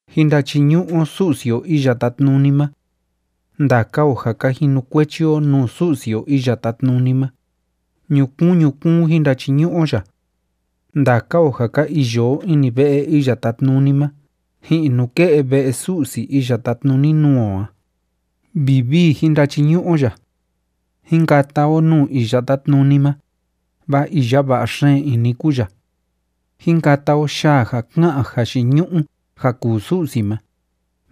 Jín ndachiñu'u o Su'si o Iya Tátnuni ma. Ndaka o ja ka jinukuechi o nuu Su'si o Iya Tátnuni ma, ñukuun ñukuun jin ndachiñu'u o ya. Ndaka o ja ka iyo o ini ve'e Iya Tátnuni ma ji'in nuke'e ve'e Su'si iya tátnuni nuu o a, vivii jín ndachiñu'u o ya. Jín kata o nuu Iya Tátnuni ma, vaa iya va'a xeen ini kúu ya. Jín kata o yaa ja ká'an jayiñu'u ja kuu Su'si ma,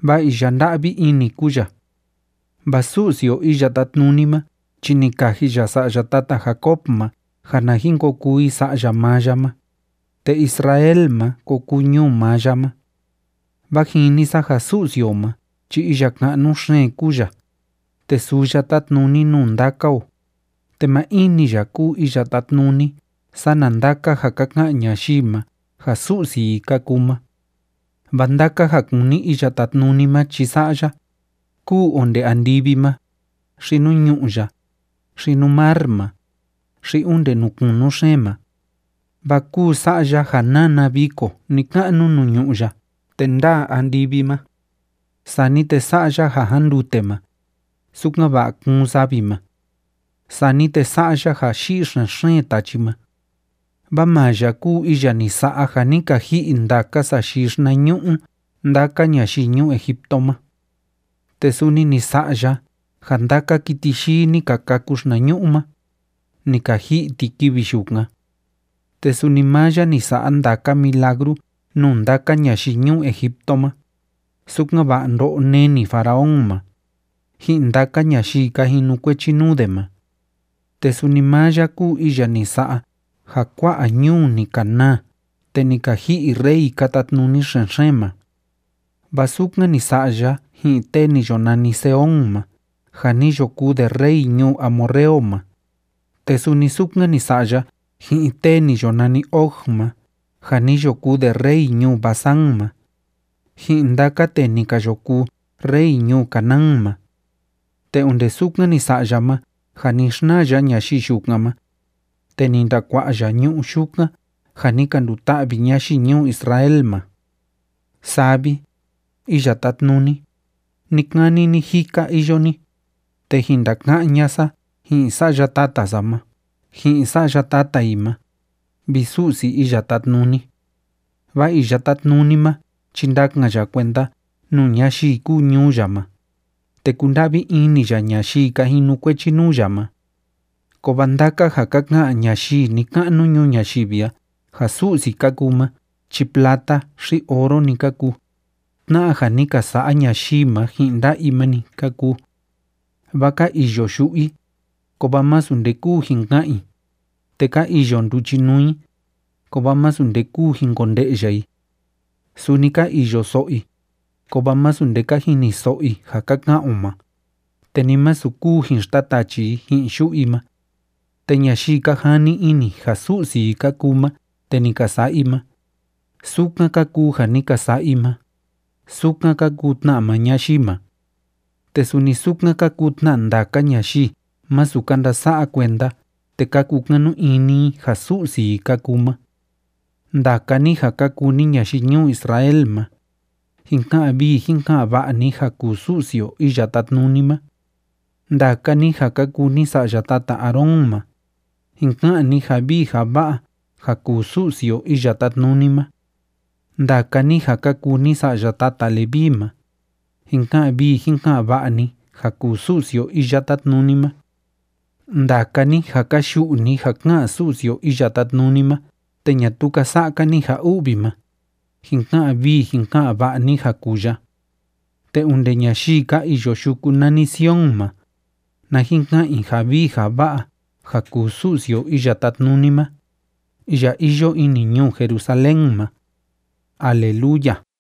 vaa iya nda'vi ini kúu ya. Vaa Su'si o Iya Tátnuni ma chi ni kaji ya sa'ya tata Jacob ma ja na jin ko kuu i sa'ya maa ya ma, te Israel ma ko kuu ñuu maa ya ma. Vaa jini sa ja Su'si o ma chi iya ka'nu xeen kúu ya, te suu ya tátnuni nuu ndaka o, te maa in‑ni ya kúu iya tátnuni sana ndaka ja ka ka'an ñayii ma ja su'si i ka kuu ma. Vaa ndaka ja kúni Iya Tátnuni ma chi sa'a ya, kúu onde andivi ma, xi nuu ñu'ú ya, xi nuu mar ma, xi onde nuu kunu xeen ma. Vaa kúu sa'a ya ja nána viko ni‑ka'nu nuu ñu'ú ya te ndáa andivi ma. Sani te sa'a ya ja jándute ma, sukan‑va'a kuun savi ma. Sani te sa'a ya ja yi'i xen‑xeen tachi ma. Vaa maa ya kúu iya ni sa'a ja ni ka ji'i ndaka sayii xinañu'u ndaka ñayii ñuu Egipto ma. Te suni ni sa'a ya ja ndaka kiti yii ni ka kâku xinañu'u ma, ni ka ji'i ti kivi yukan. Te suni maa ya ni sa'a ndaka milagru nuu ndaka ñayii ñuu Egipto ma, sukan‑va'a ndo'o neni Faraón ma, ji'in ndaka ñayii ka jinukuechi nuu de ma. Te suni maa ya kúu iya ni sa'a ja kua'a ñuu ni ka naa te ni ka ji'i rey ka tatnuni xen‑xeen ma. Vaa sukan ni sa'a ya ji'in tee ni yo nani Sehón ma ja ni yo kuu de rey ñuu amorreo ma, te suni sukan ni sa'a ya ji'in tee ni yo nani Og ma ja ni yo kuu de rey ñuu Basán ma, ji'in ndaka tee ni ka yo kuu rey ñuu Canaán ma. Te onde sukan ni sa'a ya ma ja ni xnaa ya ñayii yukan ma, te ni ndakua'a ya ñu'ú yukan ja ni ka nduta'vi ñayii ñuu Israel ma. Saa vi, Iya Tátnuni, ni‑kani ni‑jika iyo ni, te jin ndaka'án ña'a sa ji'in sa'ya tata sa ma ji'in sa'ya tata i ma, vi Su'si Iya Tátnuni. Vaa Iya Tátnuni ma chi ndakan ya kuenda nuu ñayii kúu ñuu ya ma, te kunda'vi ini ya ñayii ka jinukuechi nuu ya ma. Kovaa ndaka ja ka ka'an ñayii ni‑ka'nu ñuu ñayivi a ja su'si ka kuu ma chi plata xi oro‑ni ka kuu, tna'a ja ni ka sa'a ñayii ma ji'in nda'a i ma‑ni ka kuu. Vaa ka iyo yu'u i, kovaa masu nde kúu jin ka'an i, te ka iyo nduchinuu i, kovaa masu nde kúu jin konde'ya i. Suni ka iyo so'o i, kovaa masu nde ka jiniso'o i ja ka ka'an o ma, te ni masu kúu jin xtatachi i ji'in yu'u i ma. Te ñayii ka jani ini ja su'si i ka kuu ma te ni ka sa'a i ma, sukan ka kuu ja ni ka sa'a i ma, sukan ka kuu tna maa ñayii ma. Te suni sukan ka kuu tna ndaka ñayii masu ka ndasa'a kuenda te ka kukanu ini i ja su'si i ka kuu ma. Ndaka ni ja ka kuu ni ñayii ñuu Israel ma, jin ka'an vii jin ka'an va'a ni ja kuu Su'si o Iya Tátnuni ma. Ndaka ni ja ka kuu ni sa'ya tata Aarón ma, jin ka'an ni ja vii ja va'a ja kuu Su'si o Iya Tátnuni ma. Ndaka ni ja ka kuu ni sa'ya tata Leví ma, jin ka'an vii jin ka'an va'a ni ja kuu Su'si o Iya Tátnuni ma. Ndaka ni ja ka yu'u ni ja ká'an Su'si o Iya Tátnuni ma te ñatuu ka sa'a‑ka ni ja u'vi ma, jin ka'an vii jin ka'an va'a ni ja kuu ya. Te onde ñayii ka iyo yuku nani Sion ma, na jin ka'an i ja vii ja va'a ja kuu Su'si o Iya Tátnuni ma, iya iyo ini ñuu Jerusalén ma. ¡Aleluya!